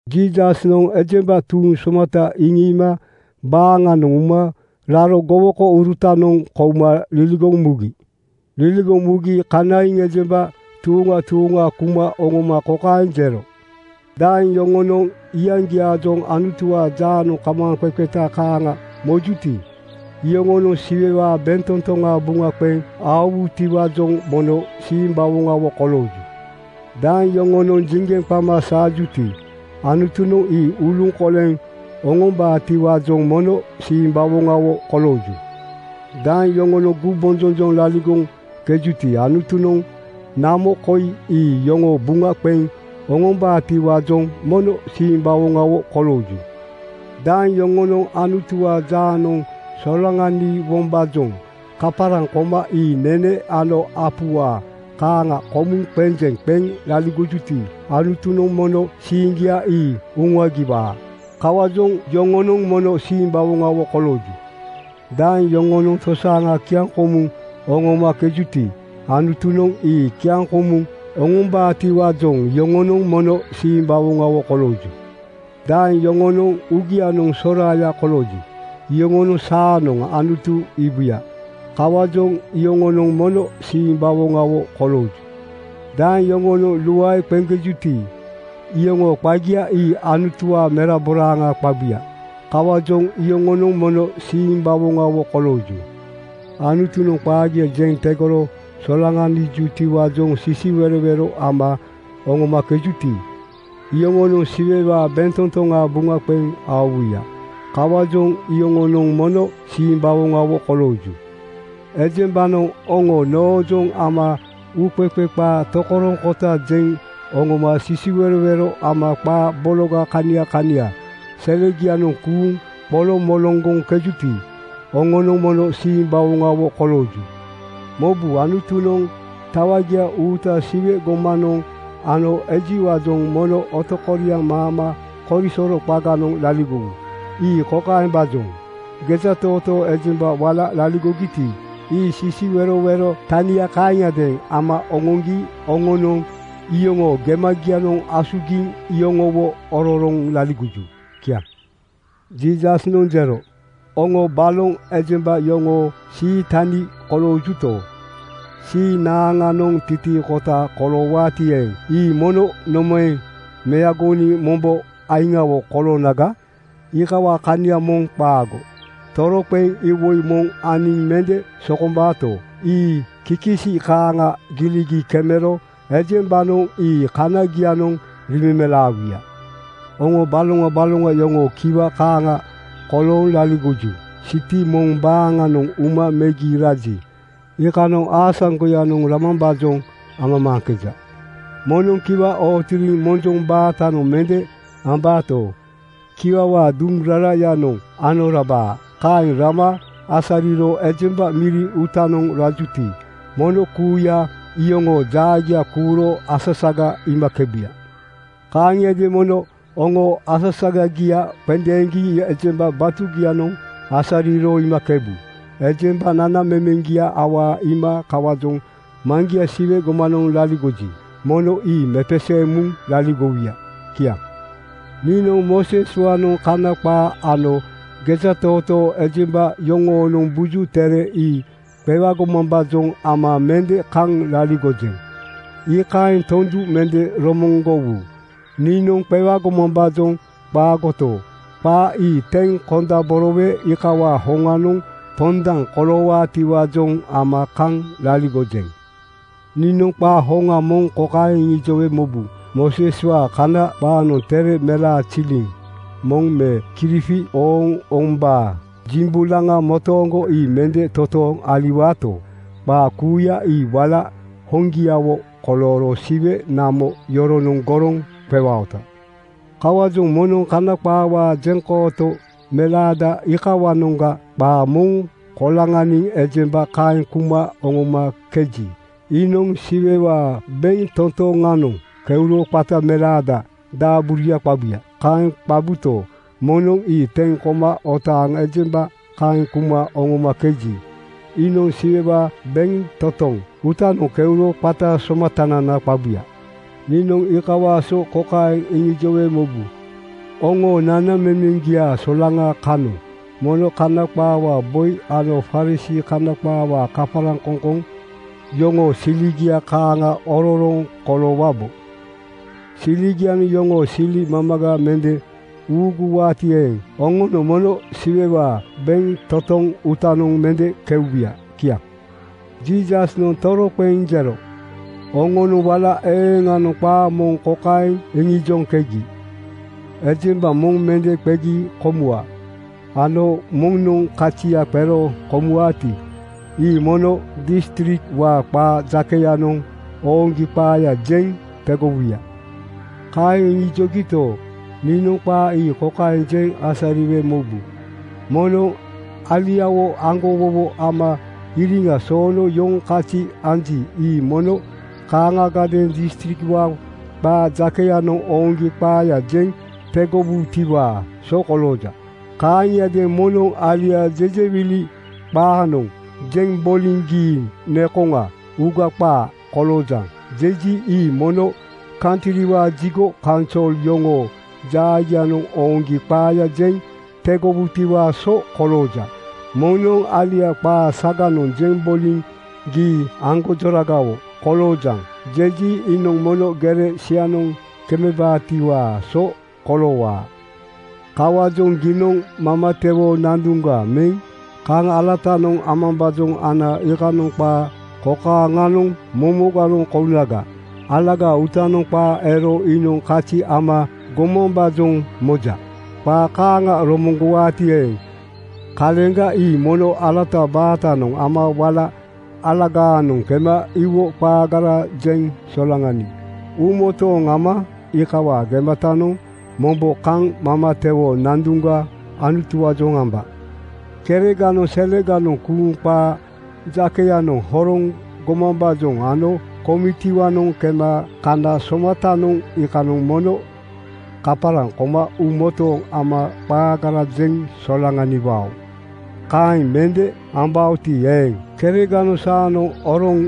Jiisasnoŋ ejemba tuuŋ somata iŋiima baaŋanoŋ uma raro gowokourutanoŋ kouma liligoŋ mugi. Liligoŋ mugi kanaiŋ ejemba tuuŋa tuuŋa kuma oŋoma kokaeŋ jero: “Daeŋ yoŋonoŋ iyaŋgiaajoŋ Anutuwaa jaanoŋ kamaaŋqeqeta kaaŋa mojuti, iyoŋonoŋ Siwewaa bentotoŋa buŋa qeŋ aowutiwaajoŋ mono simbawoŋawo kolooju. Daeŋ yoŋonoŋ jiŋgeŋ qama saajuti, Anutunoŋ ii uluŋkoleŋ oŋombaatiwaajoŋ mono simbawoŋawo kolooju. Daeŋ yoŋonoŋ gumbonjonjoŋ laligoŋkejuti, Anutunoŋ namo koi ii yoŋoo buŋa qeŋ oŋombaatiwaajoŋ mono simbawoŋawo kolooju. Daeŋ yoŋonoŋ Anutuwaa jaanoŋ solaŋaniwombaajoŋ kaparaŋ koma ii nene ano apuwaa kaaŋa komuŋ qenjeŋ qeŋ laligojuti, Anutunoŋ mono siiŋgia ii uŋuagiwaa. Kawaajoŋ yoŋonoŋ mono simbawoŋawo kolooju. Daeŋ yoŋonoŋ tosaaŋa kiaŋkomuŋ oŋomakejuti, Anutunoŋ ii kiaŋkomuŋ oŋombaatiwaajoŋ iyoŋonoŋ mono simbawoŋawo kolooju. Daeŋ yoŋoo uugianoŋ soraaya kolooji, iyoŋonoŋ saanoŋ Anutu iibuya. Kawaajoŋ iyoŋonoŋ mono simbawoŋawo kolooju. Daeŋ yoŋonoŋ luae qeŋkejuti, iyoŋoo qagia ii Anutuwaa meraboraaŋa qabuya. Kawaajoŋ iyoŋonoŋ mono simbawoŋawo kolooju. Anutunoŋ qaagia jeŋ tegoro solaŋanijutiwaajoŋ sisiwerowero ama oŋomakejuti, iyoŋonoŋ Siwewaa bentotoŋa buŋa qeŋ aowuya. Kawaajoŋ iyoŋonoŋ mono simbawoŋawo kolooju. Ejembanoŋ oŋo noojoŋ ama uuqeqe qaa tokoroŋkota jeŋ oŋoma sisiwerowero ama qaa bologa kania kania selegianoŋ kuuŋ qoloŋmoloŋgoŋkejuti, oŋonoŋ mono simbawoŋawo kolooju. Mobu, Anutunoŋ tawagia uuta Siwe gomanoŋ ano ejiwaajoŋ mono otokoriaŋ maama korisoro qaganoŋ laligowu. Ii kokaembaajoŋ: Gejatootoo ejemba wala laligogiti, ii sisiwerowero tania kaaŋiadeeŋ ama oŋoŋgi oŋonoŋ iyoŋoo gemagianoŋ asugiŋ iyoŋowo ororoŋ laligoju.” Kiaŋ. Jiisasnoŋ jero, “Oŋo baloŋ ejemba yoŋoo sii tani koloojuto, sii naaŋanoŋ titiikota koloowaati eeŋ, ii mono nomaeŋ meagoniŋ mombo aiŋawo koloonaga? Iikawaa kania moŋ qaago. Toroqeŋ iwoi moŋ aniŋ mende sokombaato, ii kikisi kaaŋa giligi kemero ejembanoŋ ii kanagianoŋ riimemelaawuya. “Oŋo baloŋa baloŋa yoŋoo kiwa kaaŋa kolooŋ laligoju. Siti moŋ baaŋanoŋ uma megi raji, iikanoŋ aasaŋgoyanoŋ ramambaajoŋ amamaaŋkeja. Moŋnoŋ kiwa ootiriŋ monjoŋ baatanoŋ mende ambaato, kiwawaa duŋ rarayanoŋ ano rabaa. Kaeŋ rama asariro ejemba miri uutanoŋ rajuti, mono kuuya iyoŋoo jaagia kuuro asasaga iimakebuya. “Kaaŋiadeeŋ mono oŋoo asasagagia qendeeŋgi ejemba batugianoŋ asariro iimakebu. Ejembanoŋ nanamemeŋgia awaa iima kawaajoŋ Maŋgia Siwe gomanoŋ laligoji, mono ii mepeseeŋ muŋ laligowuya.” Kiaŋ. “Niinoŋ Mooseswaanoŋ Kana qaa ano gejatootoo ejemba yoŋoonoŋ Buju Tere ii qewagomambaajoŋ ama mende kaŋ laligojeŋ. Iikaeŋ tondu mende romoŋgowu. Niinoŋ qewagomambaajoŋ qaagoto, qaa ii teŋ kondaborowe iikawaa hoŋanoŋ pondaŋ koloowaatiwaajoŋ ama kaŋ laligojeŋ. Niinoŋ qaa hoŋa moŋ kokaeŋ iŋijowe mobu, Mooseswaa Kana qaanoŋ tere melaaziliŋ moŋ me kirifi ooŋ-oombaa jimbolaŋa motooŋgo ii mende totooŋ aliwaato, qaa kuuya ii wala hoŋgiawo kolooro Siwe namo yoronoŋ goroŋ qewaota. “Kawaajoŋ moŋnoŋ Kana qaawaa jeŋkooto melaada iikawanoŋga qaa moŋ koloŋaniŋ ejemba kaeŋ kuma oŋomakeji, iinoŋ Siwewaa bentotoŋanoŋ keuro qata melaada daaburuya qabuya. Kaeŋ qabuto, moŋnoŋ ii teŋ koma otaaŋ ejemba kaeŋ kuma oŋomakeji, iinoŋ Siwewaa bentotoŋ uutanoŋ keuro qata Somatanana qabuya. “Niinoŋ iikawaa so kokaeŋ iŋijowe mobu: Oŋoo nanamemeŋgia solaŋa kanoŋ mono Kana qaawaa boi ano Farisii (Kana qaawaa kaparaŋkoŋkoŋ) yoŋoo siligia kaaŋa ororoŋ koloowabo. Siligianoŋ yoŋoo sili mamaga mende uuguwaati eeŋ, oŋonoŋ mono Siwewaa bentotoŋ uutanoŋ mende keubuya.” Kiaŋ. Jiisasnoŋ toroqeŋ jero, “Oŋonoŋ wala eeŋanoŋ qaa moŋ kokaeŋ iŋijoŋkegi, ‘Ejemba moŋ mende qegi komuwa,’ ano ‘Moŋnoŋ kazia qero komuwaati, ii mono distrikwaa qaa jakeyanoŋ ooŋgi qaaya jeŋ tegowuya.’ “Kaeŋ iŋijogito, niinoŋ qaa ii kokaeŋ jeŋ asariwe mobu: Moŋnoŋ aliawo aŋgowowo ama iriŋa soono yoŋ kazi anji, ii mono kaaŋagadeeŋ distrikwaa qaa jakeyanoŋ ooŋgi qaaya jeŋ tegowutiwaa so kolooja. Kaaŋiadeeŋ moŋnoŋ alia jejewili qaanoŋ jeŋ boliŋ ‘Gii nekoŋa uuga qaa koloojaŋ,’ jeji, ii mono kantriwaa jigo kaunsol yoŋoo jaagianoŋ ooŋgi qaaya jeŋ tegowutiwaa so kolooja. Moŋnoŋ alia qaa saganoŋ jeŋ boliŋ ‘Gii aŋgonjoragawo koloojaŋ,’ jeji, iinoŋ mono gere sianoŋ kemebaatiwaa so koloowaa. “Kawaajoŋ giinoŋ mamatewoo nanduŋga meŋ kaŋ alatanoŋ amambaajoŋ ana iikanoŋ qaa kokaaŋanoŋ momoganoŋ kounaga: Alagaa uutanoŋ qaa ero iinoŋ kazi ama gomambaajoŋ moja. Qaa kaaŋa romoŋgowagati eeŋ, kaleŋga ii mono alata baatanoŋ ama wala alagaanoŋ kema iwo qaagara jeŋ solaŋaniŋ uumotooŋ ama iikawaa gematanoŋ mombo kaŋ mamatewoo nanduŋga Anutuwaajoŋ amba. “Kereganoŋ seleganoŋ kuuŋ qaa jakeyanoŋ horoŋ gomambaajoŋ ano komitiwaanoŋ kema kana somatanoŋ iikanoŋ mono kaparaŋ koma uumotooŋ ama qaagara jeŋ solaŋaniwao. Kaeŋ mende ambaoti eeŋ, kereganoŋ saanoŋ oroŋ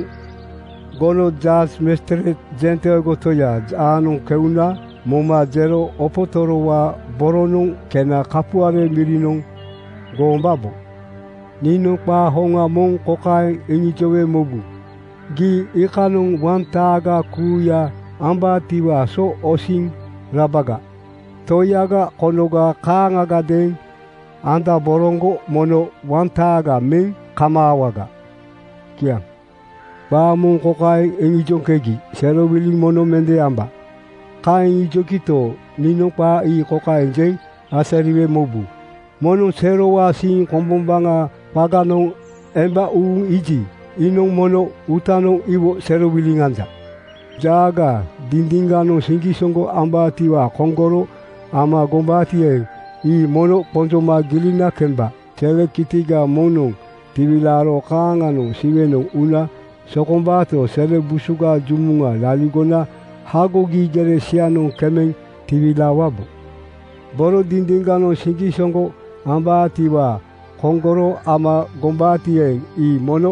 gono (jas, majistreit) jenteego toyaa jaanoŋ keuna moma jero opotorowaa boronoŋ kena kapuare mirinoŋ goombabo. Niinoŋ qaa hoŋa moŋ kokaeŋ iŋijowe mobu: Gii iikanoŋ wantaaga kuuya ambaatiwaa so osiŋ rabaga. Toiyaga konoga kaaŋagadeeŋ andoboroŋgo mono wantaaga meŋ kamaawaga.” Kiaŋ. “Qaa moŋ kokaeŋ iŋijoŋkegi, ‘Serowiliŋ mono mende amba.’ Kaeŋ iŋijogito, niinoŋ qaa ii kokaeŋ jeŋ asariwe mobu: Moŋnoŋ serowaa siiŋ kombombaŋaa qaganoŋ emba uuŋ iiji, iinoŋ mono uutanoŋ iwo serowiliŋ anja. “Jaaga dindiŋganoŋ siŋgisoŋgo ambaatiwaa koŋgoro ama gombaati eeŋ, ii mono qonjoma gilina kemba. Sele kitiga moŋnoŋ tiwilaaro kaaŋanoŋ Siwenoŋ una sokombaato, sele busuga jumuŋa laligona hagogi gere sianoŋ kemeŋ tiwilaawabo. Boro dindiŋganoŋ siŋgisoŋgo ambaatiwaa koŋgoro ama gombaati eeŋ, ii mono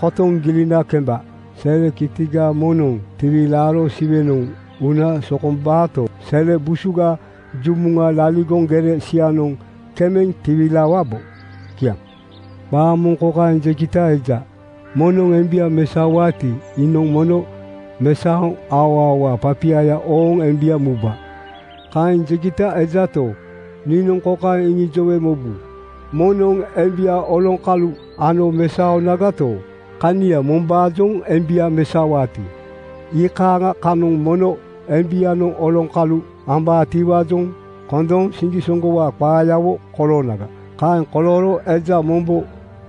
kotoŋ gilina kemba. Sele kitiga moŋnoŋ tiwilaaro Siwenoŋ una sokombaato, sele busuga jumuŋa laligoŋ gere sianoŋ kemeŋ tiwilaawabo.” Kiaŋ. “Qaa moŋ kokaeŋ jegita eja, ‘Moŋnoŋ embia mesaowaati, iinoŋ mono mesaoŋ aoaowaa papiaya ooŋ embia muba.’ Kaeŋ jegita ejato, niinoŋ kokaeŋ iŋijowe mobu: Moŋnoŋ embia oloŋkalu ano mesaonagato, kania mombaajoŋ embia mesaowaati, iikaaŋa kanoŋ mono embianoŋ oloŋkalu ambaatiwaajoŋ kondooŋ siŋgisoŋgowaa qaayawo koloonaga. Kaeŋ kolooro eja mombo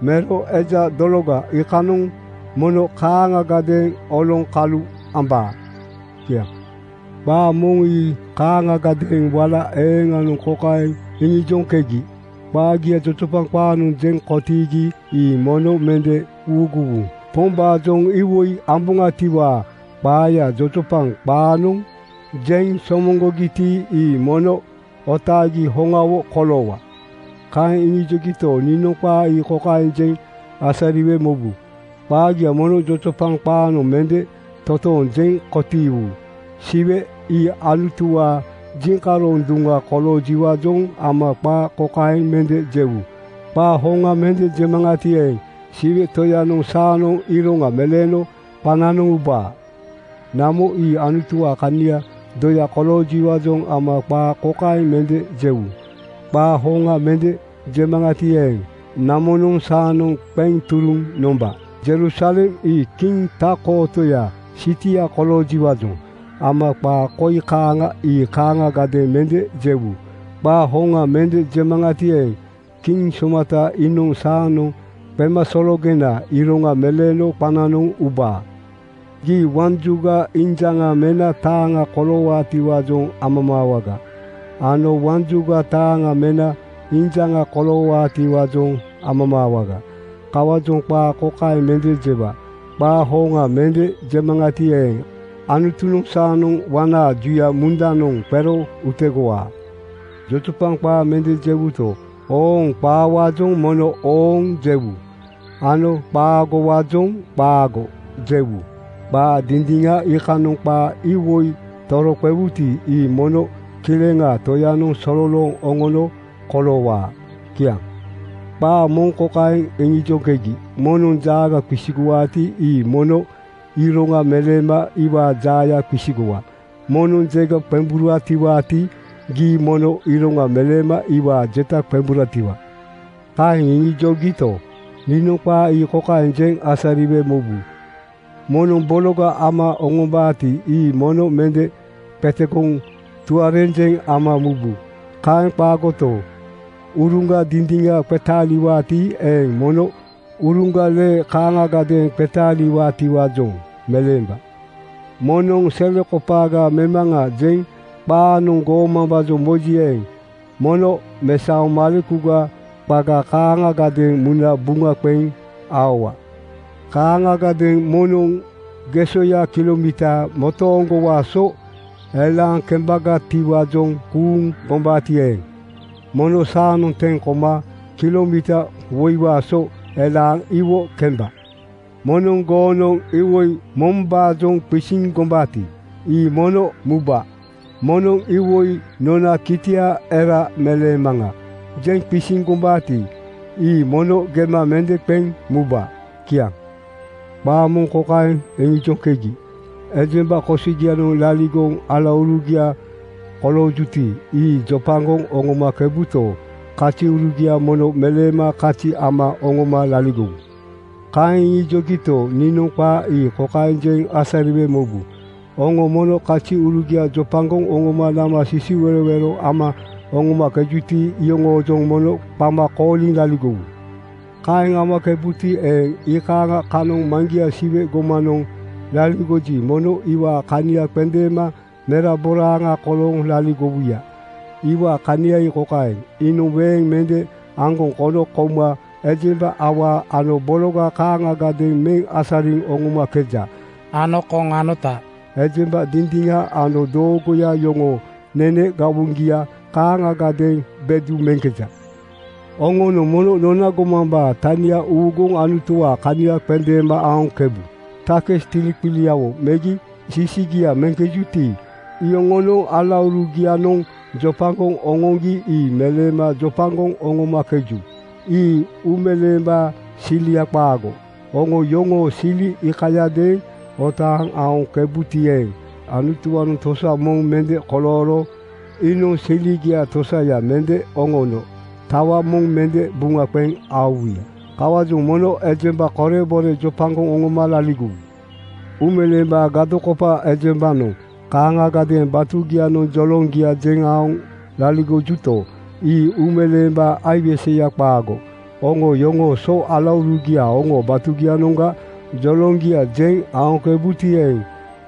mero eja dologa iikanoŋ mono kaaŋagadeeŋ oloŋkalu ambaa.” Kiaŋ. “Qaa moŋ ii kaaŋagadeeŋ wala eeŋanoŋ kokaeŋ iŋijoŋkegi, ‘Qaagia jojopaŋ qaanoŋ jeŋ kotiigiti, ii mono mende uuguwu. Pombaajoŋ iwoi amboŋatiwaa qaaya jojopaŋ qaanoŋ jeŋ somoŋgogiti, ii mono otaagi hoŋawo koloowa.’ “Kaeŋ iŋijogito, niinoŋ qaa ii kokaeŋ jeŋ asariwe mobu: Qaagia mono jojopaŋ qaanoŋ mende totooŋ jeŋ kotiiwu. Siwe ii Anutuwaa jiŋkaroŋ duŋa koloojiwaajoŋ ama qaa kokaeŋ mende jewu, ‘Qaa hoŋa mende jemaŋati eeŋ, Siwe Toyanoŋ saanoŋ iroŋa meleeno qananoŋ ubaa.’ “Namo ii Anutuwaa kaniaa doya koloojiwaajoŋ ama qaa kokaeŋ mende jewu, ‘Qaa hoŋa mende jemaŋati eeŋ, namonoŋ saanoŋ qeŋ turuŋ nomba.’ Jerusalem ii Kiŋ Tak-kootoyaa sitia koloojiwaajoŋ ama qaa koi kaaŋa ii kaaŋagadeeŋ mende jewu, ‘Qaa hoŋa mende jemaŋati eeŋ, Kiŋ Somata iinoŋ saanoŋ qemasologenaa iroŋa meleeno qananoŋ ubaa.’ Gii waŋ juga injaŋa mena taaŋa koloowaatiwaajoŋ amamaawaga ano waŋ juga taaŋa mena injaŋa koloowaatiwaajoŋ amamaawaga. Kawaajoŋ qaa kokaeŋ mende jewa, ‘Qaa hoŋa mende jemaŋati eeŋ, Anutunoŋ saanoŋ waŋnaa juya mundanoŋ qero utegowaa.’ Jojopaŋ qaa mende jewuto, ooŋ-qaawaajoŋ mono ‘Ooŋ!’ jewu ano qaagowaajoŋ ‘Qaago!’ jewu. Qaa dindiŋa iikanoŋ qaa iwoi toroqewuti, ii mono Kileŋaa Toyanoŋ sololooŋ oŋono koloowaa.” Kiaŋ. “Qaa moŋ kokaeŋ iŋijoŋkegi, ‘Moŋnoŋ jaaga qisigowaati, gii mono iroŋa meleema iwaa jaaya qisigowa. Moŋnoŋ jega qemburatiwaati, gii mono iroŋa meleema iwaa jeta qemburatiwa.’ “Kaeŋ iŋijogito, niinoŋ qaa ii kokaeŋ jeŋ asariwe mobu: Moŋnoŋ bologa ama oŋombaati, ii mono mende qetegoŋ tuarenjeŋ ama mubu. Kaeŋ qaagoto, uruŋga dindiŋa qetaaliwaati eeŋ, mono uruŋga lee kaaŋagadeeŋ qetaaliwaatiwaajoŋ meleemba. Moŋnoŋ ‘Selekopaaga memaŋa,’ jeŋ qaanoŋ goomambaajoŋ moji eeŋ, mono mesaoŋ malekuga qaga kaaŋagadeeŋ muna buŋa qeŋ aowa. “Kaaŋagadeeŋ moŋnoŋ gesoya kilomiita motooŋgowaa so elaaŋ kembagatiwaajoŋ kuuŋ gombaati eeŋ, mono saanoŋ teŋ koma kilomiita woiwaa so elaaŋ iwo kemba. Moŋnoŋ goonoŋ iwoi mombaajoŋ qisiŋ gombaati, ii mono muba. Moŋnoŋ ‘Iwoi nona kitia era meleemaŋa,’ jeŋ qisiŋ gombaati, ii mono gema mende qeŋ muba. Kiaŋ. “Qaa moŋ kokaeŋ iŋijoŋkegi, ‘Ejemba kosogianoŋ laligoŋ alaurugia koloojuti, ii jopagoŋ oŋomakebuto, kaziurugia mono meleema kazi ama oŋoma laligowu.’ “Kaeŋ iŋijogito, niinoŋ qaa ii kokaeŋ jeŋ asariwe mobu: Oŋo mono kaziurugia jopagoŋ oŋoma nama sisiwerowero ama oŋomakejuti, iyoŋoojoŋ mono qama kooliŋ laligowu. Kaeŋ amakebuti eeŋ, iikaaŋa kanoŋ Maŋgia Siwe gomanoŋ laligoji, mono iwaa kania qendeema meraboraaŋa kolooŋ laligowuya. Iwaa kania ii kokaeŋ: Iinoŋ weeŋa mende aŋgoŋ kono kouma ejemba awaa ano bologa kaaŋagadeeŋ meŋ asariŋ oŋomakeja ano koŋ anota ejemba dindiŋa ano doogoya yoŋoo nene gawoŋgia kaaŋagadeeŋ bedu meŋkeja. “Oŋonoŋ mono nona gomambaa tania uuguŋ Anutuwaa kania qendeema aoŋkebu. Takis tiliqiligiawo megi sisigia meŋkejuti, iyoŋonoŋ alaurugianoŋ jopagoŋ oŋoŋgi ii meleema jopagoŋ oŋomakeju. Ii uumeleembaa silia qaago. Oŋo yoŋoo sili iikayadeeŋ otaaŋ aoŋkebuti eeŋ, Anutuwaanoŋ tosa moŋ mende kolooro iinoŋ siligiaa tosaya mende oŋono tawa moŋ mende buŋa qeŋ aowuya. Kawaajoŋ mono ejemba korebore jopagoŋ oŋoma laligowu. “Uumeleembaa gadokopa ejembanoŋ kaaŋagadeeŋ batugianoŋ joloŋgia jeŋ aoŋ laligojuto, ii uumeleembaa aiweseya qaago. Oŋo yoŋoo so alaurugia oŋoo batugianoŋga joloŋgia jeŋ aoŋkebuti eeŋ,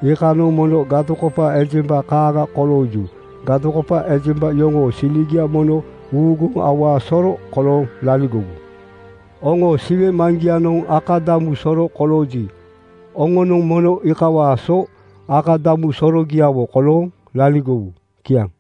iikanoŋ mono gadokopa ejemba kaaŋa kolooju. Gadokopa ejemba yoŋoo siligia mono uuguŋ awaa soro kolooŋ laligowu? Oŋoo Siwe Maŋgianoŋ akadamu soro kolooji, oŋonoŋ mono iikawaa so akadamu sorogiawo kolooŋ laligowu.” Kiaŋ.